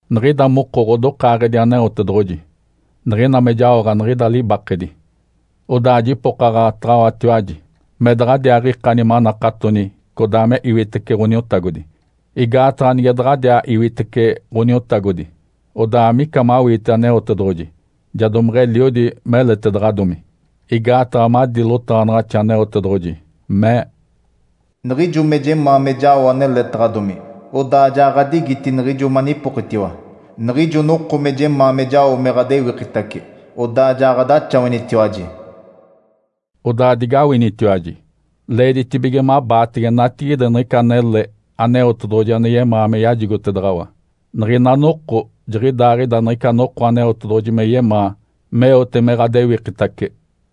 Niɡ̶ida moko ɡ̶odokaaɡ̶edi Aneotedoɡ̶oji niɡ̶ina me jaoɡ̶a niɡ̶ida libakedi. Odaa jipokaɡ̶ataɡ̶awatiwaji me daɡ̶adiaaɡ̶ikani manakatoni codaa me iwitece Ǥoniotagodi. Igaataɡ̶a nige daɡ̶adiaa iwitece Ǥoniotagodi, odaa amica mawiite Aneotedoɡ̶oji ja domeɡ̶eliodi meletedaɡ̶adomi. Igaataɡ̶a madi lotaɡ̶anaɡ̶axi, Aneotedoɡ̶oji mee, “Niɡ̶ijo me jemaa me jao aneletaɡ̶adomi, odaa ja ɡ̶adigiti niɡ̶ijo manipokitiwa. Niɡ̶ijo noko me jemaa me jao me ɡ̶adewikitace, odaa ja ɡ̶adaxawanitiwaji.” Odaa digawinitiwaji! Leeditibige mabaatege natigide niɡ̶ica anele Aneotedoɡ̶oji ane yemaa me yajigotedaɡ̶awa. Niɡ̶ina noko jiɡ̶idaaɡ̶ida niɡ̶ica noko Aneotedoɡ̶oji me yemaa meote me ɡ̶adewikitace.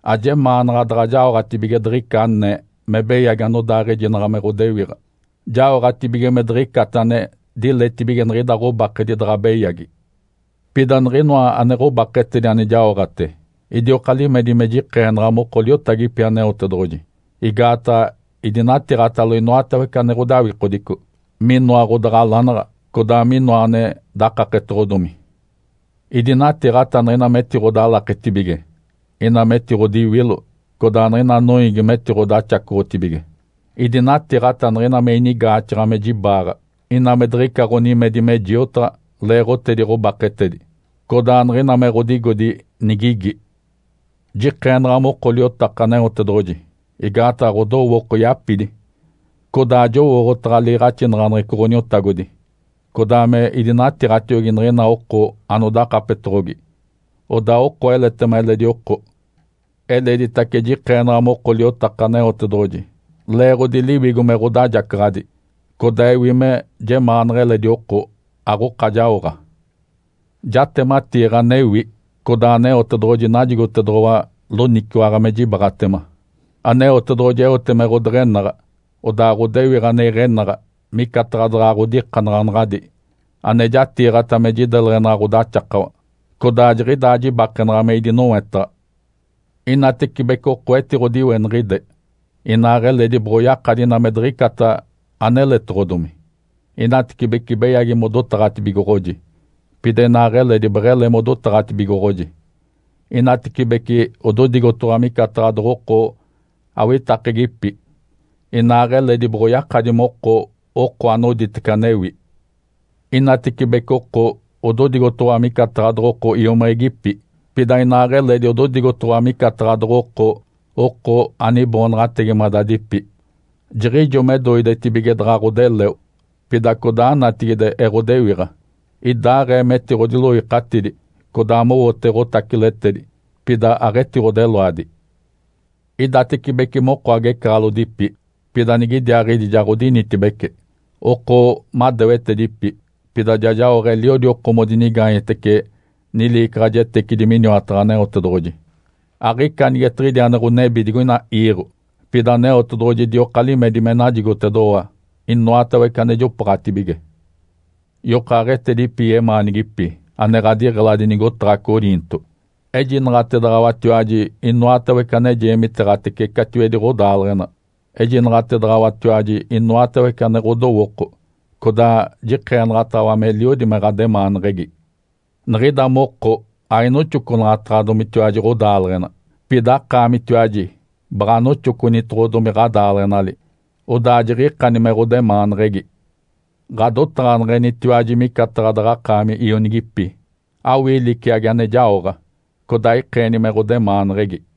Ajemaanaɡ̶a daɡ̶a jaoɡ̶atibige diɡ̶ica anee me beyagi anodaaɡ̶ejinaɡ̶a me ɡ̶odewiɡ̶a, jaoɡ̶atibige me diɡ̶icata ane diletibige niɡ̶ida ɡ̶obakedi daɡ̶a beyagi. Pida niɡ̶inoa ane ɡ̶obaketedi ane jaoɡ̶ate, idioka limedi me jikeenaɡ̶a moko liotagipi Aneotedoɡ̶oji. Igaataɡ̶a idinatiiɡ̶atalo inoatawece ane ɡ̶odawikodico, minoa ɡ̶odaɡ̶alanaɡ̶a, codaa minoa ane dakaketedoɡ̶odomi. Idinatiiɡ̶ata niɡ̶ina metiɡ̶odalaketibige, ina metiɡ̶odiwilo, codaa niɡ̶ina noiigi metiɡ̶odaxacoɡ̶otibige. Idinatiiɡ̶ata niɡ̶ina me inigaaxaɡ̶a me jibaaɡ̶a, ina me diɡ̶ica ɡ̶onimedi me jiotaɡ̶a leeɡ̶otedi ɡ̶obaketedi, codaa niɡ̶ina me ɡ̶odigodi nigigi. Jikeenaɡ̶a moko liotaka Aneotedoɡ̶oji igaataɡ̶a ɡ̶odowooko yapidi, codaa jowooɡ̶otaɡ̶a liiɡ̶axinaɡ̶aneɡ̶eco Ǥoniotagodi, codaa me idinatiiɡ̶atiogi niɡ̶ina oko anodakapetoɡ̶ogi, odaa oko eletema eledi oko. Eleditace jikeenaɡ̶a moko liotaka Aneotedoɡ̶oji leeɡ̶odi Liwigo me ɡ̶odajacaɡ̶adi, codaa ewi me jemaanaɡ̶a eledi oko, aɡ̶oka jaoɡ̶a. Jatematiiɡ̶a anewi, codaa Aneotedoɡ̶oji najigotedoɡ̶owa loniciwaɡ̶a me jibaaɡ̶atema. Aneotedoɡ̶oji eote me ɡ̶odeɡ̶enaɡ̶a, odaa ɡ̶odewiɡ̶a ane iɡ̶enaɡ̶a micataɡ̶a daɡ̶a ɡ̶odikanaɡ̶anaɡ̶adi ane jatiiɡ̶ata me jideleɡ̶enaɡ̶a ɡ̶odaxakawa, codaa jiɡ̶idaa jibakenaɡ̶a me idinowetaɡ̶a. Inatecibece oko etiɡ̶odiweniɡ̶ide, inaaɡ̶eledi boɡ̶oyakadi ina me diɡ̶icata aneletoɡ̶odomi. Inatecibece beyagi modotaɡ̶atibigoɡ̶oji, pida inaaɡ̶eledi beɡ̶ele modotaɡ̶atibigoɡ̶oji. Inatecibece ododigotoɡ̶owa micataɡ̶a doɡ̶oko awitakegipi, inaaɡ̶eledi boɡ̶oyakadi moko oko anoditece anewi. Inatecibece oko ododigotoɡ̶owa micataɡ̶a doɡ̶oko iomiɡ̶igipi, pida inaaɡ̶eledi ododigotoɡ̶owa micataɡ̶a doɡ̶oko oko aniboonaɡ̶ategimadadipi. Jiɡ̶ijo me doidetibige daɡ̶a ɡ̶odeleo, pida codaa natigide eɡ̶odewiɡ̶a. Idaaɡ̶ee metiɡ̶odiloikatidi, codaa mowote ɡ̶otaciletedi, pida aɡ̶etiɡ̶odeloadi. Idatecibece moko agecaɡ̶alodipi, pida niɡ̶idiaaɡ̶idi ja ɡ̶odinitibece. Oko madewetedipi, pida ja jaoɡ̶a eliodi oko modinigaanyetece niliicaɡ̶ajetecidi miniwataɡ̶a Aneotedoɡ̶oji. Aɡ̶ica anigetiɡ̶idi ane ɡ̶onebi digoina iiɡ̶o, pida Aneotedoɡ̶oji idioka limedi me najigotedoɡ̶owa inoatawece ane jopooɡ̶atibige. Yokaaɡ̶etedipi yemaanigipi ane ɡ̶adiɡ̶eladi nigotaɡ̶a Coriinto. Ejinaɡ̶atedaɡ̶awatiwaji inoatawece ane jeemiteeɡ̶atece catiwedi ɡ̶odaaleɡ̶ena. Ejinaɡ̶atedaɡ̶awatiwaji inoatawece ane ɡ̶odowooko, codaa jikeenaɡ̶ataɡ̶awa meliodi me ɡ̶ademaanaɡ̶aneɡ̶egi. Niɡ̶ida moko ainoxoconaɡ̶ataɡ̶adomitiwaji ɡ̶odaaleɡ̶ena, pida akaamitiwaji baɡ̶a anoxoconitoɡ̶odomi ɡ̶adaaleɡ̶enali, odaa jiɡ̶ikani me ɡ̶odemaaneɡ̶egi. Ǥadotaɡ̶aneɡ̶enitiwaji micataɡ̶a daɡ̶akaami ionigipi. Awii liciagi ane jaoɡ̶a, codaa ikeeni me ɡ̶odemaaneɡ̶egi.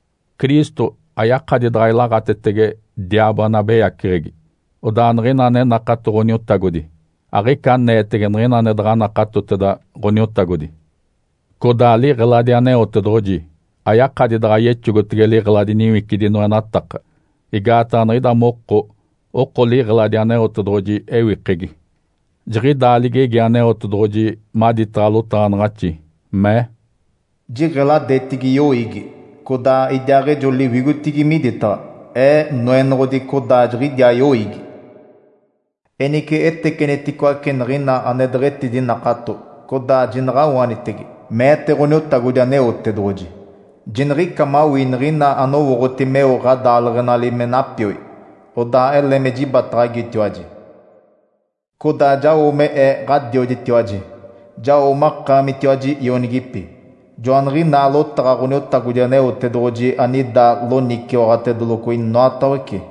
Cristo ayakadi daɡ̶a ilaɡ̶atetege diaabo ane abeyaceɡ̶egi. Odaa niɡ̶ina ane nakato Ǥoniotagodi aɡ̶ica aneetege niɡ̶ina ane daɡ̶a nakatoteda Ǥoniotagodi. Codaa liɡ̶eladi Aneotedoɡ̶oji ayakadi daɡ̶a yexogotege liɡ̶eladi niwicidi noenataka. Igaataɡ̶a niɡ̶ida moko oko liɡ̶eladi Aneotedoɡ̶oji ewikegi. Jiɡ̶idaa ligegi Aneotedoɡ̶oji maditaɡ̶a lotaɡ̶anaɡ̶axi, mee, “‘Jiɡ̶eladetigi yoiigi, codaa idiaaɡ̶ejo liwigotigi miditaɡ̶a. Ee Noenoɡ̶odi, codaa jiɡ̶idiaa yoiigi. Enice eteceniticoace niɡ̶ina ane deɡ̶etidinakato, codaa jinaɡ̶awanitege’, meete Ǥoniotagodi Aneotedoɡ̶oji. ‘Jiniɡ̶ica mawii niɡ̶ina anowooɡ̶oti meo ɡ̶adaaleɡ̶enali me napioi. Odaa ele me jibataɡ̶agitiwaji. Codaa jao me Ee Ǥadioditiwaji. Jao makaamitiwaji ionigipi’. Joaniɡ̶inaa lotaɡ̶a Ǥoniotagodi Aneotedoɡ̶oji anida loniciwaɡ̶atedeloco inoatawece.”